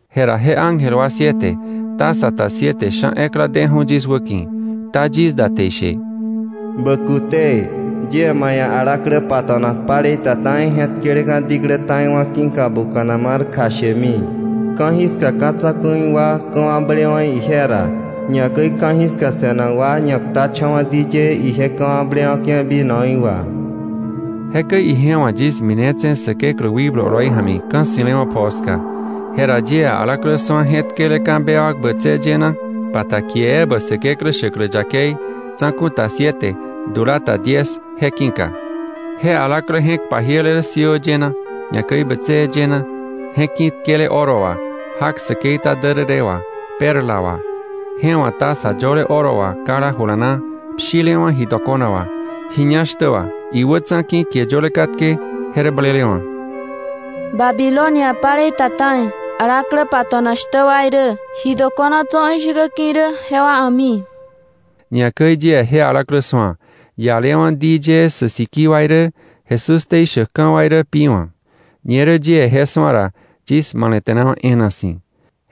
Jera je ángel wa siete, taza ta siete sha̱ ekla deju̱ yis wäki̱, kta yis da te ishe: “Bä kute; yie ma ia̱ alaklä pato̱nak palei ta ta̱i je̱tkeleka̱ diklä ta̱iwa̱ ki̱ka buka̱na mar kjashemi. Ka̱jiska ka̱ tsa̱ku̱i wa ka̱wakblewa̱ ije ra, ñakäi ka̱jiska se̱nak wa ñaktacha̱wa̱ di yee ije ka̱wakblewa̱ke̱ vinoí wà.” Jekäi ije wa̱ yis minetse̱ Säkeklä wikblu oloi ja̱mi ka̱ ssi̱lewa̱ pjoo ska. Jera yie alaklä su̱a je̱tkeleka̱ bewak bätsëë yëna, pa ta kie ebä Säkeklä shäklä yakei, tsa̱ku̱ ta siete, dula ta diez, je ki̱ka. Je alaklä je̱k pajiele rä siöö yëna, ñakäi bätsëë yëna, je̱k ki̱tkele oro wà, jak säkei ta därërë wà, perla wà. Je wa̱ taza yöle oro wà kala ijula na pshilewa̱ ji dokona wà, ji ñá shtä wà. Iwätsa̱ ki̱ kie yöle katke, je rä blelewa̱: “Babilonia palei ta ta̱i, alaklä pato̱nak shtä wa irä, ji dokona tso̱ ishäkä ki̱ irä, jewa a̱mi.” Ñakäi yie je alaklä su̱a, ialewa̱ di yëë sä sikii wa irä, Jesús ktei shäkka̱ wa irä pi wa̱. Ñerä yie je su̱a ra yis male̱te̱nawa̱ e̱e̱na si̱.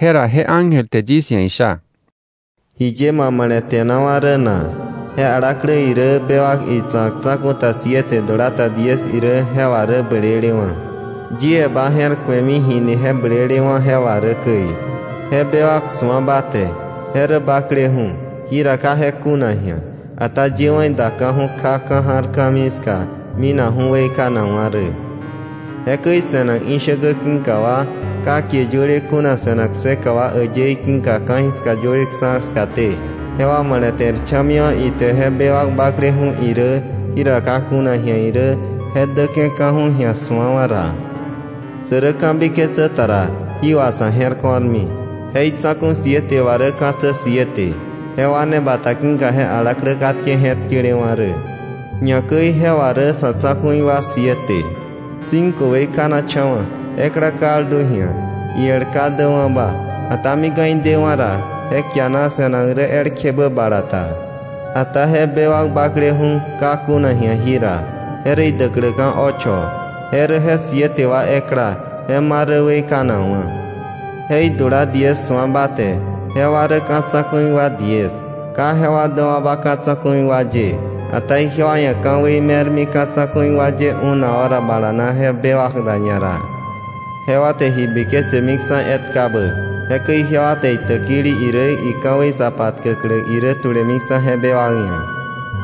Jera je ángel te yis ia̱ isha: “¿Jiye ma male̱te̱nawa̱ rä na? Je alaklä irä, bewak itsa̱k, tsa̱ku̱ ta siete, dula ta diez irä je wà rä blelewa̱. Yie ba je̱r ku̱emi ji ni je blelewa̱ je wà rä käi.” Je bewak su̱a ba te, je rä bakleju̱, jira ka je kuna ji̱a, ata yewa̱ idaka̱ju̱ kja ka̱ ja̱r ka̱mii ska, minakju̱ weikanakwa̱ rä. Jekäi se̱nak ishäkä ki̱ka wa, ka kie yöle kuna se̱nak kseka wa äyëí ki̱ka ka̱jiska yöleksa̱ skaté, jewa male̱te̱rcha̱miwa̱ ite je bewak bakleju̱ irä, jira ka kuna ji̱a irä, je däke̱ka̱ju̱ ji̱a su̱awa̱ ra. Sä rä ka̱biketsä ta ra, jí wà sa̱ je̱r ko̱rmi. Je itsa̱ku̱ siete wà rä ka̱tsä siete, jewa ne bata ki̱ka je alaklä katke je̱tkelewa̱ rä, ñakäi je wà rä sa̱ tsa̱ku̱i wa siete. Cinco weikanacha̱wa̱, ekla kaldu ji̱a, iel ka däwa̱ba, ata mika̱ idewa̱ ra, je kiana se̱nak rä elkjebä bala ta. Ata je bewak bakleju̱, ka kuna ji̱a jira, je rä idäkläka̱ ocho; je rä je siete wa ekla, je ma rä weikanakwa̱. “Je idula diez su̱a ba te, jewa rä ka̱ tsa̱ku̱i wa diez. Ka jewa däwa̱ba ka̱ tsa̱ku̱i wa ye, ata ijewa ia̱ ka̱wei me̱rmi ka̱ tsa̱ku̱i wa ye una hora bala na je bewak ra ñara. Jewa te ji biketsemiksa̱ etkabä, jekäi ijewa te itäkili irä, ika̱wei sa patkäklä irä tulemiksa̱ je bewak ia̱.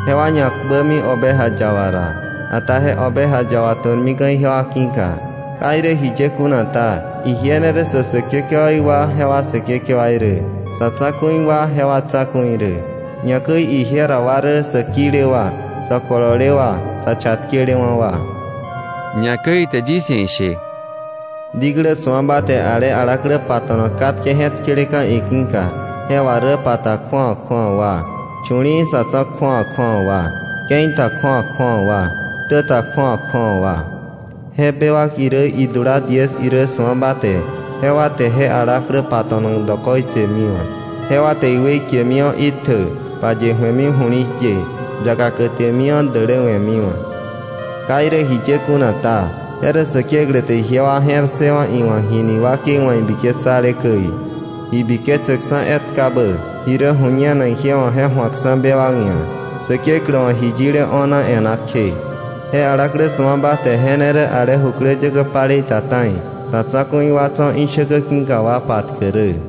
Jewa ñakpämi Oveja Yaba ra. Ata je Oveja Yaba tu̱rmika̱ ijewa ki̱ka. Ka irä jiye kuna ta, ije ne rä sä säkekewaí wa jewa Säkekewaí rä, sa̱ tsa̱ku̱i wa jewa Tsa̱ku̱i rä. Ñakäi ije ra wa rä sä kile wa, sä kolole wa, sä chatkelewa̱ wa.” Ñakäi ite yis ia̱ ishe: “Diklä su̱a ba te ale alaklä pato̱nak katke je̱tkeleka̱ iki̱ka, je wà rä pa ta kju̱awa kju̱awa wa, chu̱li̱i̱wa̱ sa̱ tso̱ kju̱awa kju̱awa wa, ke̱i ta kju̱awa kju̱awa wa, ktä ta kju̱awa kju̱awa wa. Je idula irä bewak irä diez su̱a ba te, jewa te je alaklä pato̱nak dokoitsemiwa̱. Jewa te iweikemiwa̱ itjä, paye ju̱emi ju̱li̱shye, yaka kätemiwa̱, däläwe̱miwa̱. Ka irä jiye kuna ta, je rä Säkeklä te ijewa je̱r ssëwa̱ iwa̱k jini iwakei wa̱ ibiketsale käi, ji biketsäkksa̱ etkabä, ji rä ju̱ñenak ije wa̱ je ju̱akksa̱ bewak ia̱, Säkeklä wa̱ ji yile o̱na e̱ná kje. Je alaklä su̱a ba te je ne rä ale jukläyäkä palei ta ta̱i, sa̱ tsa̱ku̱i wa tso̱ ishäkä ki̱ka wa patkäk rä.”